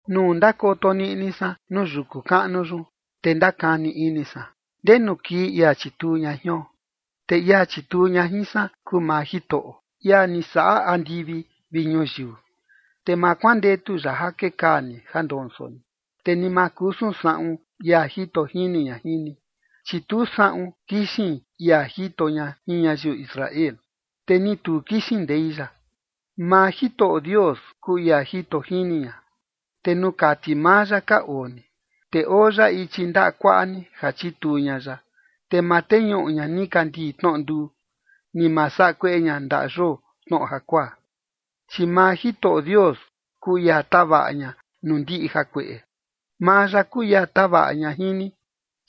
Nuu ndakoto niꞌni san nuu yuku kaꞌnu yun te ndakani ini san, ¿ndenu kii ia chituu ña jion? Te ia chituu ña jin san kuu maa Jitoꞌo, ia ni saꞌa andivi vi ñuyiu. Te ma kuandetu ya ja kekaa ni ja ndonso ni, te ni ma kusun saꞌun ia jito jini ña jin ni. Chi tu saꞌun kixin ia jito ña jin ñayiu Israel, te ni tu kixin ndei ya. Maa Jitoꞌo Dios kuu ia jito jini ña, te nuu kati maa ya ka oo ni. Te oo ya ichi ndaꞌa kuaꞌa ni ja chituu ña ya. Te ma teñuꞌu ña nikandii tnoꞌo nduu, ni ma saꞌa kueꞌe ña ndaꞌa yoo tnoꞌo jakuaa. Chi maa Jitoꞌo Dios kuu ia tavaꞌa ña nuu ndiꞌi jakueꞌe. Maa ya kuu ia tavaꞌa ña jin ni.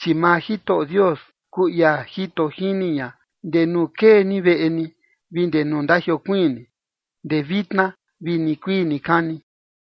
Chi maa Jitoꞌo Dios kuu ia jito jini ña ndee nuu kee ni veꞌe ni vi ndee nuu ndajiokuiin ni, ndee vitna vi nikuii nikani.